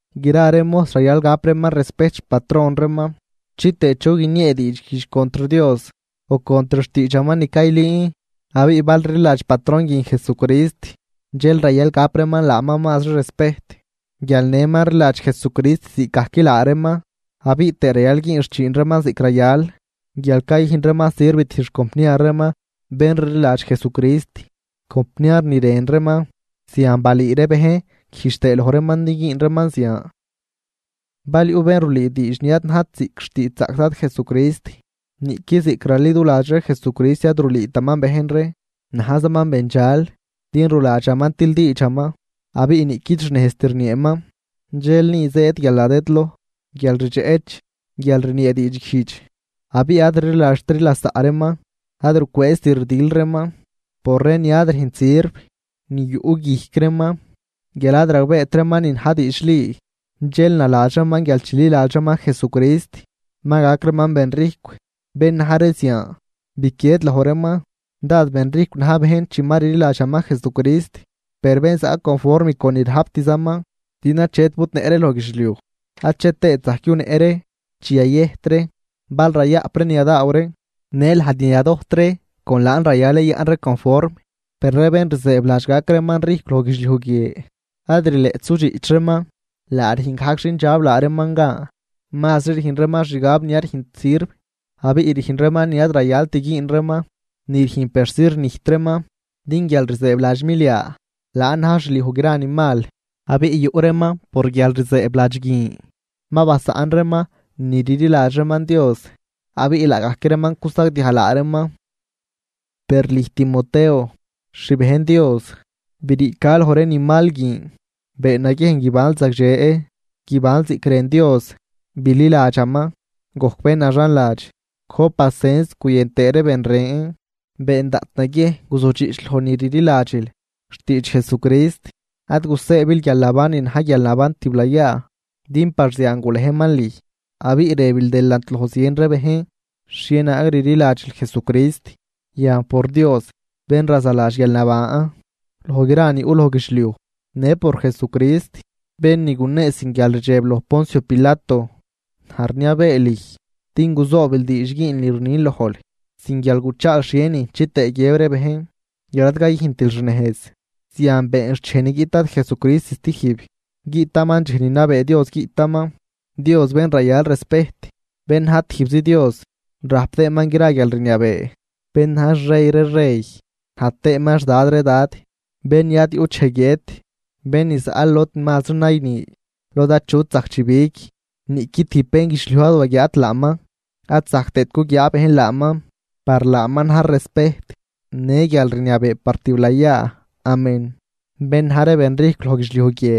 Gra ree mojs rayal gap reeman respejt xpatron reeman chitëë chu guiniee diidxguijdx contr Dios o contr xtiidxaman ni caylüün. Abiꞌ bal rliladx patron guin Jesucrist dxel rayal gap reeman laaman mazri respejt guial nëman rliladx Jesucrist ziꞌcgajc laa reeman. Abiꞌ tëë rayal güün xchiin reeman ziꞌc rayal guial cayüjn reeman sirv tijb xcompniar reeman bén rliladx Jesucrist compniar ni rën reeman. Zian balüü ree bejn güjdx tëë loj reeman din güün reeman zian. Bal yuꞌ bén rulüü diidx ni ad najt ziꞌc xtiidxzaꞌc Dad Jesucrist niꞌqui ziꞌc raliduladx ree Jesucrist ad rulüütaman bejn ree, najzaman bendxal. Din ruladxaman tildiidxaman abiꞌ niꞌquid xnejzt rnieeman, dxel ni zëëd guialnadëdloj, guial rdxeꞌch, guial rniee diidxguijdx abiꞌ ad rliladxtri lasaꞌ reeman, ad rucwëëzt rdil reeman por ree ni ad rüjnt sirv ni yuꞌ guijc reeman guial ad ragbeet reeman ni na̱j diidxli, dxel naladx reeman guial chililadx reeman Jesucrist ma gac reeman ben rijcw. Bén na̱j ree zian, biquied loj reeman. Dad ben rijcw na̱j bejn chi ma rliladxaman Jesucrist, per bén zaꞌ conform con ni rajptzaman. Din achet budnëꞌ ree loj guidxliuj ache tëët zajc yunëꞌ ree chi yayëjt ree. Bal rayaꞌp ree ni yadaaw ree në lajd ni yadojt ree con laan rayal yayaꞌn ree conform. Per ree bén rzëëbladx gac reeman rijcw loj guidxliuj guie ad rileꞌt sudxiꞌch reeman, laa rüjn gajc xindxab laa reeman gan. Mazri rüjn reeman xgab ni ad rüjnt sirv abiꞌ rüjn reeman ni ad rayalt güün reeman ni rüjn persi rnijt reeman. Din guial rzëëbladx milia laan na̱j xliuj gra ni mal. Abiꞌ yuꞌ reeman por guialrzëëbladx guin ma basaꞌn reeman ni rliladx reeman Dios abiꞌ laagajc reeman cusagdiaj laa reeman. Per lüj Timoteo, xbejn Dios, briica loj ree ni mal guin. Been naguiejn guibanl zagdxe, guibanl ziꞌc rën Dios, bililadxaman, gojc bén naxanladx, gojp pacens guyën tëë ree ben ren. Been daꞌt naguiejn guzudxiꞌch loj ni rliladxil xtiidx Jesucrist. Ad gusëëbil guialnaban ni na̱j guialnaban tiblayaa, din par zian gulejman lüj abiꞌ rëbil delant loj zien ree bejn xhienaag rliladxil Jesucrist. Yan, por Dios bén razaladx guialnaban loj gra ni yuꞌ loj guidxliuj në por Jesucrist bén ni gunee sin guialrdxeb loj Poncio Pilato, naj rniabee lüj din guzoobil diidx güünl ni rnin lojl, sin guial guchaal xhienin chitëë guiëb ree bejn guial ad cayüjntil xnejz. Zian been xt dxej ni guiꞌt Dad Jesucrist stijb. Guiꞌtaman dxej ni nabee Dios guiꞌtaman, Dios bén rayal respejt bén na̱j tijbzi Dios rajp tëëman gra guialrniabee, bén na̱j xrey ree rey naj tëëman xDad ree dad. Bén ni ad yuꞌt dxej guiët, Bén ni zaꞌ lod mazri nayni lod achut zajc chibig. Niꞌqui tijb bénguidxliuj ad waguiaat laaman ad zajc tëët guguiaa bejn laaman. ¡Par laaman na̱j respejt në guialrniabee par tiblayaa! Amén. Bén na̱j ree benrijcw loj guidxliuj guie,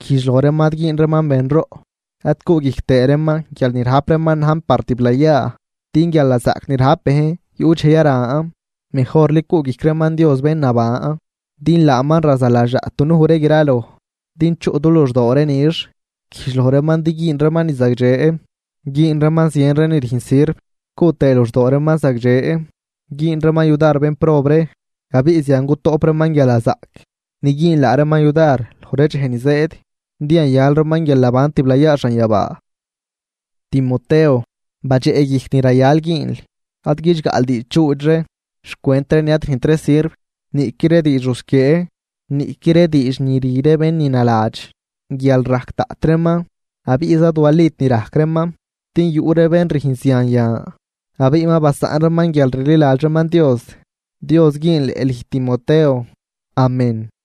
güjdx loj reeman ad güün reeman benroꞌ ad cuꞌguijc tëë reeman guial ni rajp reeman najn par tiblayaa, din guialnazaꞌc ni rajp bejn yuꞌ dxej yaran. Mejorli cuꞌguijc reeman Dios bén naban din laaman razaladx daꞌt dunuj ree graloj din chuꞌ du luxdoo ree nix. Güjdx loj reeman din güün reeman ni zagdxe, güün reeman zien ree ni rüjn sirv, cuꞌ tëë luxdoo reeman zagdxe güün reeman yudar bénprob ree. Abiꞌ zian gutoꞌp reeman guialnazaꞌc ni güün laa reeman yudar loj ree dxej ni zëëd din yayal reeman guialnaban tiblayaa xanyabaa. Timoteo, badxeꞌguijc ni rayal güünl, Ad guidxgaꞌl diidxdxuudx ree xcwent ree ni ad rüjnt ree sirv, niꞌqui ree diidx rusquiee, niꞌqui ree diidx ni rü ree bén ni naladx guial rajc daꞌt reeman abiꞌza ad walit ni rajc reeman. Din yuꞌ ree bén rüjn zian yan, abiꞌ ma basaꞌn reeman guialrliladx reeman Dios. Dios güünleꞌ lüj Timoteo. Amén.